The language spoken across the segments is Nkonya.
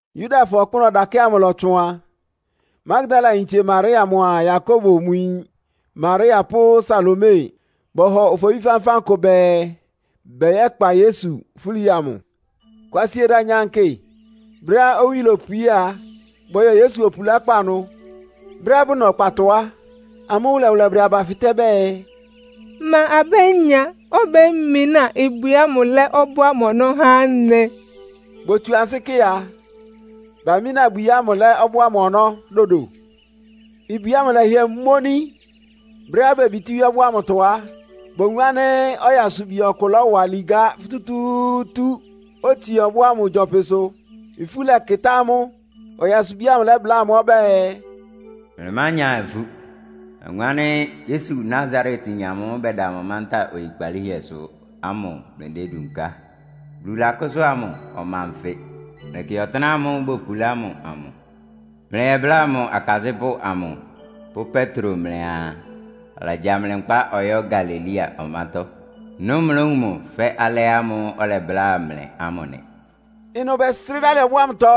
Yudafɔ ɔkpʋ́nʋ́ ɔdakɛ́ ámʋ ɩlɔtsʋn a, Magdalayintse Maria mʋa Yakobo mʋ yin Maria pʋ́ Salome bɔhɔ ofobí fánfán kʋ bɛɛ, bɛyɛ́kpa Yesu fúli amʋ. Kwasieda nyankɩ, brɛ́á owí lopwié a, bɔyɔ Yesu opulákpá ɩnʋ. Brɛ́á bʋna ɔkpatɔ á, amʋ́ wʋlɛwʋlɛ bʋdɛ aba fɩtɛ́ bɛɛ, “Ma abénya obémináa ibwi ámʋ lɛ́ ɔbɔ́ ámʋ ɔnɔ́ há anɩ?” Botsu ansɩ́ kɩ a, bamína ibwi ámʋ lɛ́ ɔbɔ́ ámʋ ɔnɔ́ dodo. Ibwi ámʋ lɛ́hɩɛ móní. Brɛ́á bebitíwíé ɔbɔ́ ámʋtɔ á, bowun ánɩ́ ɔyasubi ɔkʋ lɔ́wa ligá futútúútú, otsie ɔbɔ́ ámʋ gyɔpɩsʋ. Ifú lɛkɩtá amʋ́. Ɔyasubi ámʋ lɛ́bláa amʋ́ ɔbɛ́ɛ, “Mlɩmánya ifú. Nawun ánɩ́ Yesu Nasaretyin amʋ́ʋ́ bɛda mántá oyikpalíhɛsʋ ámʋ mlɩdédunká. Bulu lakʋ́sʋ́a mʋ, ɔma nfɩ. Mlɩkɩ ɔtɩ́nɛ́ ámʋ́ʋ́ bopulá mʋ amʋ. Mlɩyɛbláa mʋ akasɩ́pʋ́ amʋ pʋ́ Petro mlɩaa, alagya mlɩ nkpá ɔyɔ́ Galilea ɔmátɔ́. Ɩnʋ́ mlówun mʋ fɛ́ alɩ ámʋ́ʋ́ ɔlɛbláa mlɩ ámʋ nɩ.” Ɩnʋ bɛsrɩ́ dalɩ ɔbɔ́ ámʋtɔ,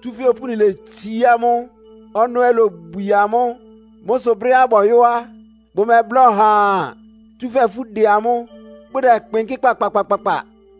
tsúfɛ́ opúni letsií amʋ́, ɔnɔ́ ɛ́ lobwie amʋ́. Mʋ́ sʋ brɛ́á bɔyɔ á, bʋmɛbláa ɔhaa, tsúfɛ́ ifú dɛ amʋ́, bʋdɛkpɩnkɩ́ kpakpakpakpa.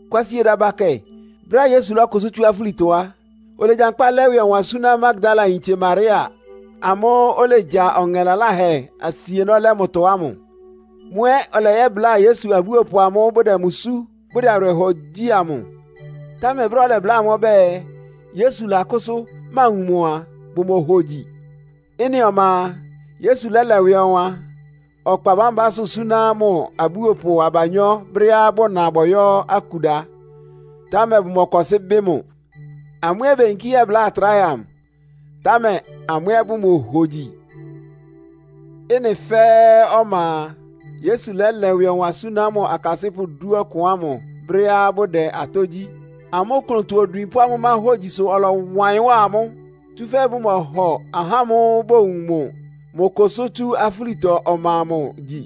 [Kwasieda bakɛ, brɛ́á Yesu lɔ́kʋsʋ́ tsú afúlitɔ á, olegyankpá lɛ́ ɩwɩ ɔwan súná Magdalayintse Maria amʋ́ʋ́ olegya ɔŋɛ laláhɛ asienɔ́ lɛ́ mʋtɔ ámʋ. Mʋ ɛ́ ɔlɛyɛ́bláa Yesu abúopʋ amʋ́ʋ́ bʋdɛ mʋ sú, bʋdɛ awɩrɛhɔ gyí amʋ. Támɛ brɛ́á ɔlɛbláa amʋ́ ɔbɛ́ɛ, Yesu lakʋ́sʋ́, mawun mʋ a, bʋmohogyi. Ɩ́nɩ ɔma a, Yesu lɛ́lɛ ɩwɩ ɔwan ɔkpa bámbásʋ́ súná mʋ abúopʋ abanyɔ́ brɛ́á bʋna bɔyɔ́ akuda, támɛ bʋmɔkɔsɩ́ bɩ́ mʋ. Amʋ́ ɛ́ beyinkí yɛ́bláa atráhɛ amʋ, támɛ amʋ́ ɛ́ bʋmohogyi. Ɩ́nɩ fɛ́ɛ́ ɔma a, Yesu lɛ́lɛ ɩwɩ ɔwan súná mʋ akasɩ́pʋ́ dúɔkʋn ámʋ brɛ́á bʋdɛ atɔ́ gyí. Amʋ́ klʋntɔ-odwin pʋ́ amʋ́ máhógyi sʋ ɔlɔwa ɩyɩn wá amʋ́. Tsúfɛ́ bʋmɔhɔ ahá ámʋ́ʋ́ bowun mʋ mʋ kʋsʋ́ tsú afúlitɔ ɔma amʋ gyi.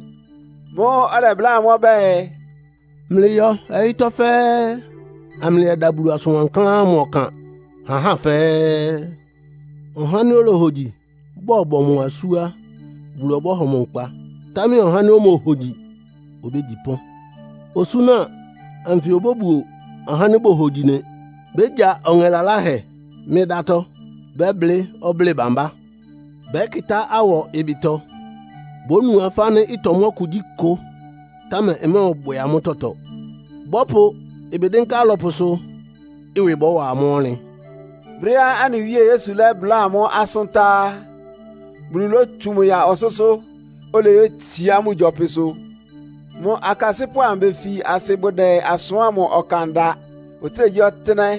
Mʋ́ʋ́ ɔlɛbláa amʋ́ ɔbɛ́ɛ, “Mlɩyɔ ɔyɩ́tɔ́ fɛ́ɛ́, amlɩyɛda Bulu asʋn wankláán ámʋ ɔkan ha ahá fɛ́ɛ́. Ɔha ánɩ́ olohogyi, bɔbɔ mʋ asú á, Bulu ɔbɔ́hɔ mʋ nkpa, támɛ ɔhá ánɩ́ omohogyi obégyi pɔ́n. Osúna anfɩ obóbuo ahá ánɩ́ bohogyi nɩ. Bégya ɔŋɛ laláhɛ mɩ́ ɩdátɔ́, bɛ́blɩ́ ɔblɩ́ɩ bámbá, bɛ́kɩtá awɔ ɩbɩtɔ, bónu afá ánɩ́ ɩtɔmɔ́ kugyíkʋ, támɛ ɩmɔ́ɔbwɛ amʋ́ tɔtɔ. Bɔ́pʋ ɩbɩ dɩ́nká alɔpʋsʋ, ɩwɩ bɔ́wa amʋ́ ɔnlɩn.” Brɛ́á anɩ Wíe Yesu lɛ́bláa amʋ́ asʋ́n tá á, Bulu lótsu mʋ ya ɔsʋ́sʋ́, oleyétsiá mʋ gyɔpɩsʋ. Mʋ akasɩ́pʋ́ amʋ befi asɩ bʋdɛ asʋ́n ámʋ ɔkan da ɔtɩ́nɛgyíɔtɩ́nɛ́.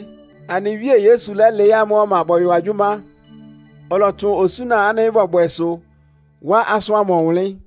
Anɩ Wíe Yesu lɛ́lɩɩ́ amʋ́ ɔma bɔyɔ agyʋ́má. Ɔlɔtsʋn osúna ánɩ́ bɔbwɛsʋ, wá asʋ́n ámʋ ɔwʋnlɩ́n.]